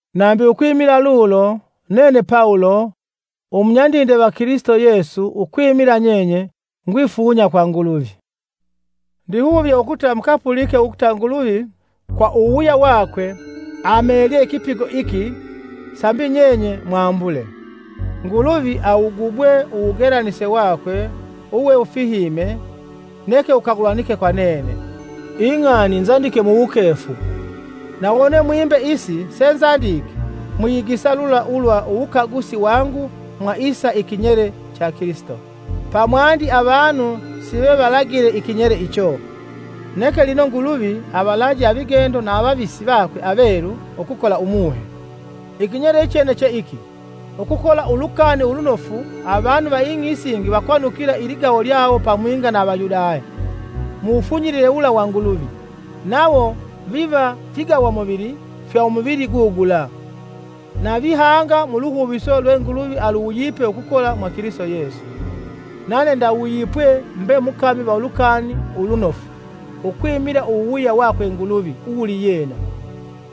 Nambi ukwimila lulo, nene Pawulo, umunyandinde va Kilisito Yesu ukwimila nyenye, ngwifunya kwa Nguluvi. Ndihuvye ukuta mukapulike ukuta Nguluvi, kwa uwuwuya wakwe, amelye ikipigo iki sambi nyenye mwambule. Nguluvi awugubwe uwugelanise wakwe uwewufihime neke wukagulanike kwa nene. Ing'ani is nzandike muwukefu, na wone mwimbe isi senzandike mwiyigisa lula ulwa uwukagusi wangu mwa isa ikinyele cha Kilisito. pamwandi avanu sivevalagile ikinyele icho; neke lino Nguluvi avalaje avigendo na avavisi vakwe avelu ukukola Umuhe. Ikinyele ichene che iki, ukukola Ulukani Ulunofu avanu va ing'i isingi vakwanukila iligawo lyawo pamwinga na Avayudaya mu wufunyilile wula wa Nguluvi; nawo viva figawamuvili fya umuvili gugula, na vihanga mu luhuviso lwe Nguluvi aluwuyipe ukukola mwa Kilisito Yesu. Nane ndawuyipwe mbe mukami va Ulukani Ulunofu ukwimila uwuwuya wakwe Nguluvi uwuliyena,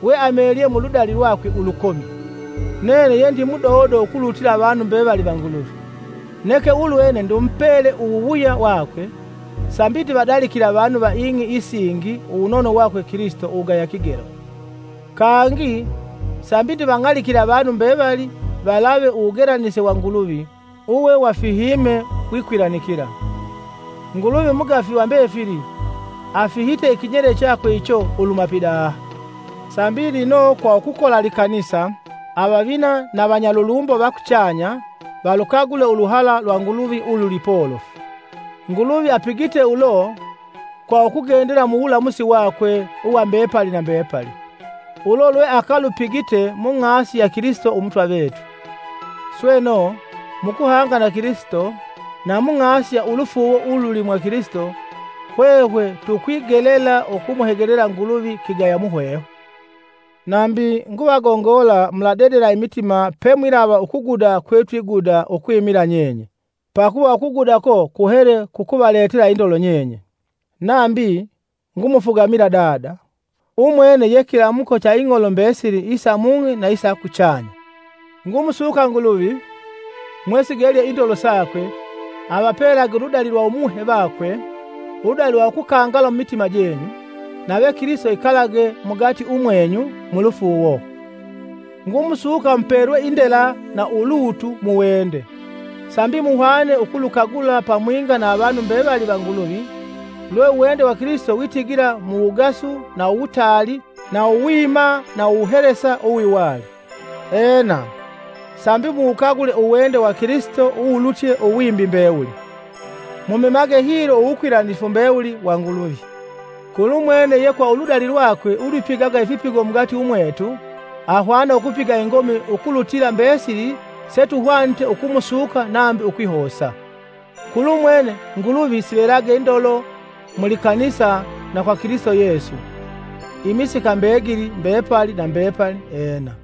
weamelye muludali lwakwe ulukomi. Nene yendi mudodo ukulutila avanu mbevali va Nguluvi; neke ulwene ndimupele uwuwuya wakwe, sambi ndivadalikile avanu va ing'i isingi uwunono wakwe Kilisito uwugaya kigelo, kangi sambi ndivang'alikile avanu mbevali valave uwugelanise wa Nguluvi uwe wafihime wikwilanikila. Nguluvi umugafi va mbefili afihite ikinyele chakwe icho luhuma pidaha, sambi lino, kwa ukukola likanisa, avavina na vanyalulumbo va kuchanya valukagule uluhala lwa Nguluvi ululi polofu. Nguluvi apigite ulo kwa ukugendela muwulamusi wakwe uwa mbepali na mbepali, ulo lweakalupigite mung'asi ya Kilisito Umutwa vetu. Sweno, mukuhanga na Kilisito, na mung'asi ya ulufuuwo ululi mwa Kilisito, hwehwe tukwigelela ukumuhegelela Nguluvi kigaya muhwehwe. Nambi, nguvagongola muladedela imitima pemwilava ukuguda kwetwiguda ukwimila nyenye, pakuva ukuguda uko kuhele kukuvaletela indolo nyenye. Nambi, ngumufugamila Dada, umwene ye kilamuko cha ing'olo mbesili isa mung'i isa kuchanya. Ngumusuka Nguluvi, mwesigelye indolo sakwe, avapelage uludali lwa Umuhe vakwe, uludali lwa ukukangala mumitima jenyu, nave Kilisito ikalage mugati umwenyu mulufuuwo. Ngumusuka mupelwe indela na ulutu mu wende sambi muhwane ukulukagula pamwinga na avanu mbevali va Nguluvi lwe uwende wa Kilisito witigila mu wugasu na uwutaali, na uwima na uwuhelesa uwiwali. Ena, sambi muwukagule uwende wa Kilisito uwulutye uwimbi mbewuli, mumemage hilo uwukwilanifu mbewuli wa Nguluvi. Kulumwene ye kwa uludali lwakwe ulwipigaga ifipigo mugati umwetu ahwana ukupiga ingomi ukulutila mbesili setuhwanite ukumusuka nambi ukwihosa, kulumwene Nguluvi sivelage ndolo mu likanisa na kwa Kilisito Yesu, imisika mbegili, mbepali na mbepali! Ena.